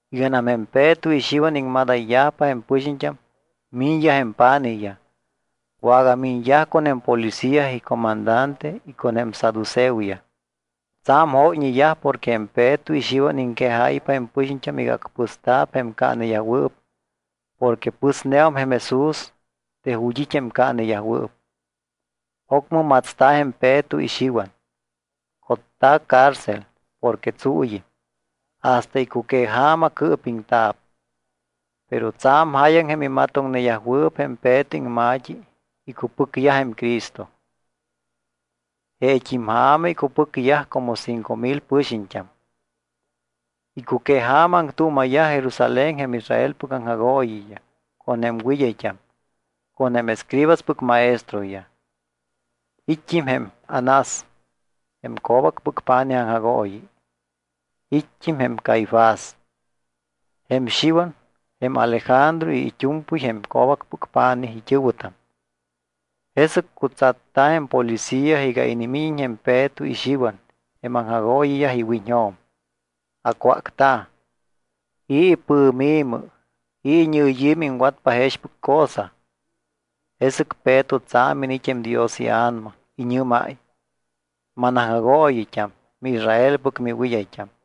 Iganam jém Peto y Xiwan iŋmadayyajpa jém pɨxiñt́am, miñyaj jém pa̱nijyaj. Wagamiñyaj con jém policía icomandante y con jém saduceoyaj. Tsa̱m jóyñeyaj porque jém Peto y Xiwan iŋquejáypa jém pɨxiñt́am iga acpɨsta̱p jém caaneyajwɨɨp porque pɨsneum jém Jesús de ju̱t́ it́ jém caaneyajwɨɨp. Ocmɨ matsta̱ jém Peto y Xiwan, cotta̱ cárcel porque tsuuyɨm. Hasta icuqueja̱ma cɨɨpiŋta̱p. Pero tsa̱m jáyaŋ jém imatoŋneyajwɨɨp jém Peto iŋma̱t́i icupɨcyaj jém Cristo. Jeet́im ja̱ma icupɨcyaj como cinco mil pɨxiñt́am. Icuqueja̱ma aŋtuuma̱yaj Jerusalén jém Israelpɨc aŋjagooyiyaj, con jém wɨd́ayt́am, con jém escribaspɨc maestroyaj. It́t́im jém Anás jém co̱bacpɨc pa̱nij aŋjagooyi. It́t́im jém Caifás, jém Xiwan, jém Alejandro y it́u̱mpɨy jém co̱bacpɨc pa̱nij it́ɨ̱wɨtam. Jesɨc cutsatta̱ jém policía iga inimíñiñ jém Peto y Xiwan jém aŋjagooyiyaj iwiñjo̱m. Acwácta̱: —¿I̱ ipɨ̱mi̱mɨ, i̱ iñɨyi̱mɨ iŋwatpa jexpɨc cosa? Jesɨc Peto tsa̱m iniit́ jém Dios iA̱nama. Iñɨ́máy: —Manaŋjagooyit́am, miIsraelpɨc miwɨd́ayt́am,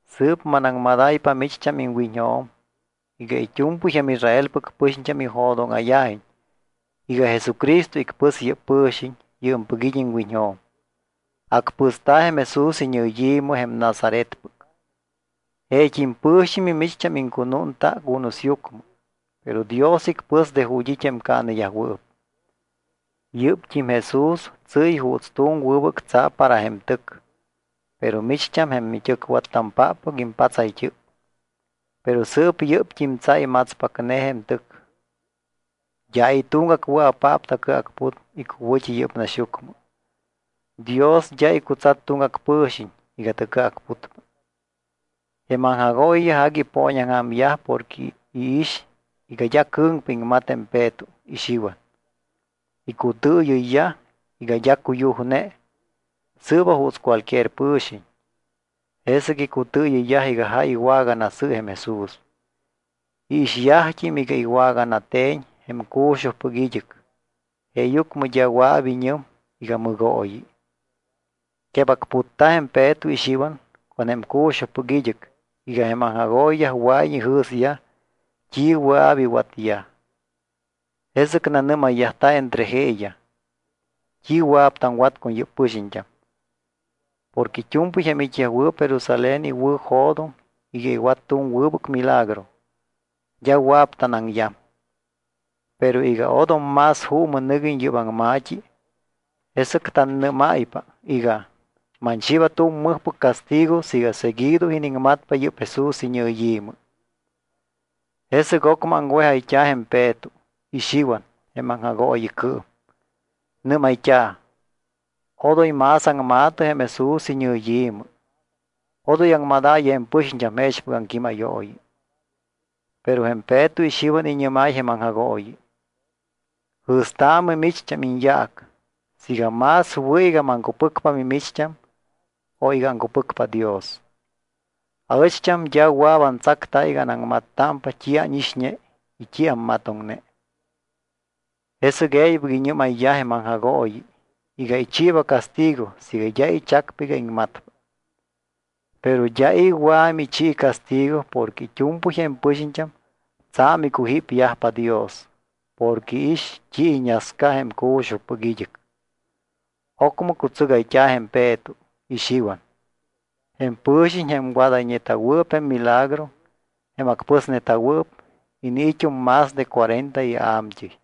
Sɨɨp manaŋmadáypa micht́am iŋwiñjo̱m iga it́u̱mpɨy jém Israelpɨc pɨxiñt́am ijo̱dóŋa̱yajiñ iga Jesucristo icpɨs yɨ́p pɨ̱xiñ yɨɨmpɨc it́ iŋwiñjo̱m. Acpɨsta̱ jém Jesús iñɨyi̱mɨ, jém Nazaretpɨc. Jeet́im pɨ̱xiñ mimicht́am iŋcunúnta cunusyucmɨ. Pero Dios icpɨs de ju̱t́ it́ jém caaneyajwɨɨp. Yɨ́pt́im Jesús tsɨ́y juuts tu̱m wɨbɨc tsa para jém tɨc. Pero micht́am, jém mit́ɨcwattampáppɨc, impatsayt́ɨp. Pero sɨɨp yɨ́pt́im tsa imatspacne jém tɨc. D́a i̱ tuŋgac wɨa̱paap tacɨacput icuwɨ̱t́i yɨ́p naxyucmɨ. Dios d́a icutsat tuŋgac pɨ̱xiñ iga tacɨacputpa. Jém aŋjagooyiyaj agui ipooñaŋja̱myaj porque iix iga d́a cɨ̱ŋpa iŋmat jém Peto y Xiwan. Icutɨɨyɨyyaj iga d́a cuyujne, sɨɨba juuts cualquier pɨ̱xiñ. Jesɨc icutɨɨyɨyyaj iga jáy iwaganasɨ jém Jesús. Iixyajt́im iga iwaganate̱ñ jém cu̱xujpɨc id́ɨc, jeeyucmɨ d́a wɨa̱p iñɨm iga mɨgooyi. Quebacputta̱ jém Peto y Xiwan con jém cu̱xujpɨc id́ɨc iga jém aŋjagooyiyaj wɨa̱iñ ijɨ̱syaj t́i wɨa̱p iwatyaj. Jesɨc nanɨ́mayyajta̱ entre jeeyaj: —¿T́i wɨa̱p taŋwat con yɨ́p pɨxiñt́am? Porque it́u̱mpɨy jém it́yajwɨɨp Jerusalén iwɨ̱jo̱doŋ iga iwat tu̱m wɨbɨc milagro. D́a wɨa̱p tanaŋyam. Pero iga odom más juumɨ nɨguiñ yɨ́p aŋma̱t́i, jesɨc tannɨ́máypa iga: Manchiiba tu̱m mɨjpɨc castigo siiga seguido iniŋmatpa yɨ́p Jesús iñɨyi̱mɨ. Jesɨc ocmɨ aŋwejayt́a̱ jém Peto y Xiwan jém aŋjagooyicɨɨm. Nɨ́mayt́a̱: —Odoy más aŋma̱tɨ jém Jesús iñɨyi̱mɨ. Odoy aŋmadaayɨ jém pɨxiñt́am jexpɨc aŋquímayooyi. Pero jém Peto y Xiwan iñɨ́máy jém aŋjagooyi: —Jɨ̱staamɨ micht́am iñyaac siiga más wɨ̱ iga maŋcupɨcpa mimicht́am o iga aŋcupɨcpa Dios. Aɨcht́am d́a wɨa̱p antsacta iga anaŋmattámpa t́i ánixñe y t́i ammatoŋne. Jesɨc e̱ybɨc iñɨ́mayyaj jém aŋjagooyi iga ichiiba castigo siiga d́a ichacpa iga iŋmatpa. Pero d́a i̱ wɨa̱ michi castigo porque it́u̱mpɨy jém pɨxiñt́am tsa̱m icujípyajpa Dios porque iix t́i iñasca jém cu̱xujpɨc id́ɨc. Ocmɨ cutsɨgayt́a̱ jém Peto y Xiwan. Jém pɨ̱xiñ jém wadayñeta̱wɨɨp jém milagro, jém acpɨsneta̱wɨɨp, iniit́um más de cuarenta ia̱mt́ɨy.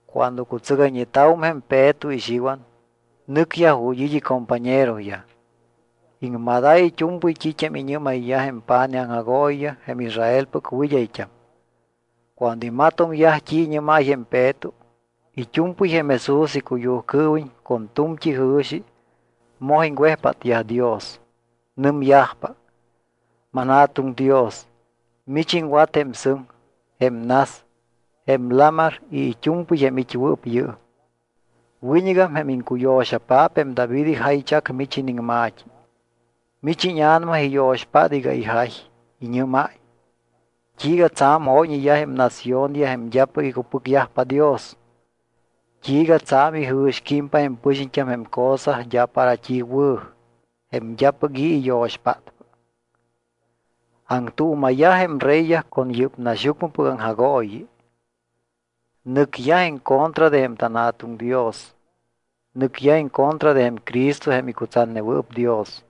Cuando cutsɨgayñeta̱wum jém Peto y Xiwan, nɨcyaj ju̱t́ it́ icompañeroyaj. Iŋmadáy it́u̱mpɨy t́it́am iñɨ́mayyaj jém pa̱nij aŋjagooyiyaj y jém Israelpɨc wɨd́ayt́am. Cuando imatoŋyaj t́i iñɨ́máy jém Peto, it́u̱mpɨy jém Jesús icuyujcɨɨwiñ con tu̱mt́i jɨ̱xi moj iŋwejpátyaj Dios. Nɨmyajpa: —ManJa̱tuŋ Dios, mich iŋwat jém sɨŋ, jém nas, jém lamar y it́u̱mpɨy jém it́wɨɨp yɨɨm. Wiñɨgam jém iŋcuyo̱xapaap jém David ijaychac mich iniŋma̱t́i. Mich íñA̱nama iyo̱xpát iga ijay. Iñɨ́máy: ¿T́iiga tsa̱m jóyñeyaj jém naciónyaj jém d́apɨc icupɨcyajpa Dios? ¿T́iiga tsa̱m ijɨ̱squímpa jém pɨxiñt́am jém cosa d́a para t́i wɨ̱, jém d́apɨc i̱ iyo̱xpátpa? Aŋtuuma̱yaj jém reyyaj con yɨ́p naxyucmɨpɨc aŋjagooyi. Nɨcyaj en contra de jém tanJa̱tuŋ Dios, nɨcyaj en contra de jém Cristo jém icutsatnewɨɨp Dios.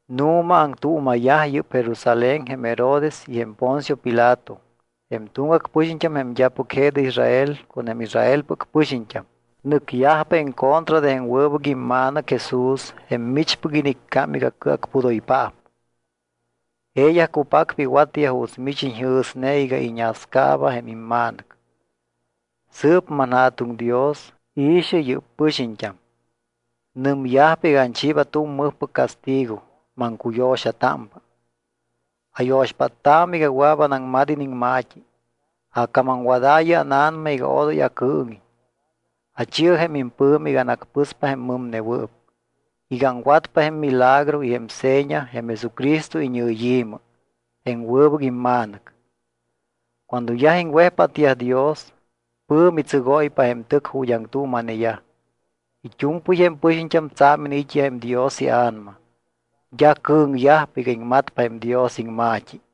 ’Nu̱ma aŋtuuma̱yaj yɨ́p Jerusalén jém Herodes y jém Poncio Pilato, jém tuŋgac pɨxiñt́am jém d́apɨc je de Israel con jém Israelpɨc pɨxiñt́am. Nɨcyajpa en contra de jém wɨbɨc imMa̱nɨc Jesús jém michpɨc iniccám iga Cɨacpudoypaap. Jeeyaj cupacpa iwatyaj juuts mich iñjɨ̱sne iga iñascaaba jém imMa̱nɨc. Sɨɨp manJa̱tuŋ Dios, i̱xɨ yɨ́p pɨxiñt́am. Nɨmyajpa iga achiiba tu̱m mɨjpɨc castigo. Maŋcuyo̱xatámpa. Ayo̱xpáttaamɨ iga wɨa̱p anaŋmat iniŋma̱t́i. Acamamwadaayɨ ána̱nama iga odoy acɨɨŋiñ. Achi̱ɨ jém impɨ̱mi iga anacpɨspa jém mɨmnewɨɨp, iga aŋwatpa jém milagro y jém seña jém Jesucristo iñɨyi̱mɨ, jém wɨbɨc imMa̱nɨc. Cuando yaj iŋwejpátyaj Dios, pɨ̱mi tsɨgóypa jém tɨc ju̱t́ aŋtuuma̱neyaj. It́u̱mpɨy jém pɨxiñt́am tsa̱m iniit́yaj jém Dios iA̱nama. D́a cɨ̱ŋyajpa iga iŋmatpa jém Dios iŋma̱t́i.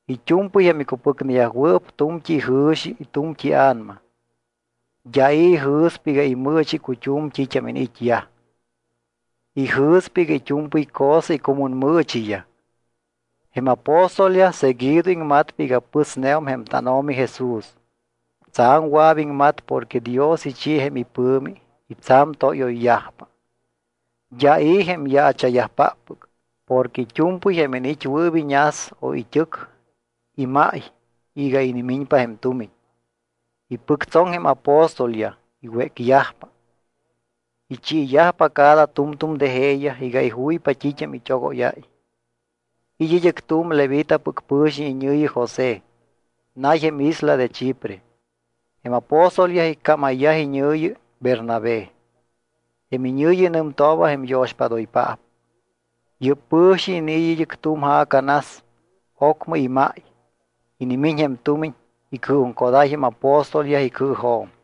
It́u̱mpɨy jém icupɨcneyajwɨɨp tu̱mt́i ijɨ̱xi y tu̱mt́i ia̱nama. D́a i̱ ijɨ̱spa iga imɨɨchi icut́um t́it́am iniit́yaj. Ijɨ̱spa iga it́u̱mpɨy cosa icumunmɨɨchiyaj. Jém apóstolyaj seguido iŋmatpa iga pɨsneum jém tánO̱mi Jesús. Tsa̱m wɨa̱p iŋmat porque Dios ichi jém ipɨ̱mi y tsa̱m tóyoyyajpa. D́a i̱ jém yaacha̱yajpáppɨc. Porque it́u̱mpɨy jém iniit́wɨɨp iñas o it́ɨc, imáy iga inimiñpa jém tumiñ. Ipɨctsoŋ jém apóstolyaj, iwécyajpa, ichiiyajpa cada tu̱mtu̱m de jeeyaj iga ijuypa t́it́am it́ogóyáy. It́ id́ɨc tu̱m levitapɨc pɨ̱xiñ iñɨ̱yi José. Nay jém isla de Chipre. Jém apóstolyaj iccámayyaj iñɨ̱yi, Bernabé. Jém iñɨ̱yi nɨmtooba jém yo̱xpádoypaap. Yɨ́p pɨ̱xiñ iniit́ id́ɨc tu̱m ja̱ca nas, ocmɨ imáy. Inimiñ jém tumiñ, icɨɨjuŋcodáy jém apóstolyaj icɨɨjo̱m.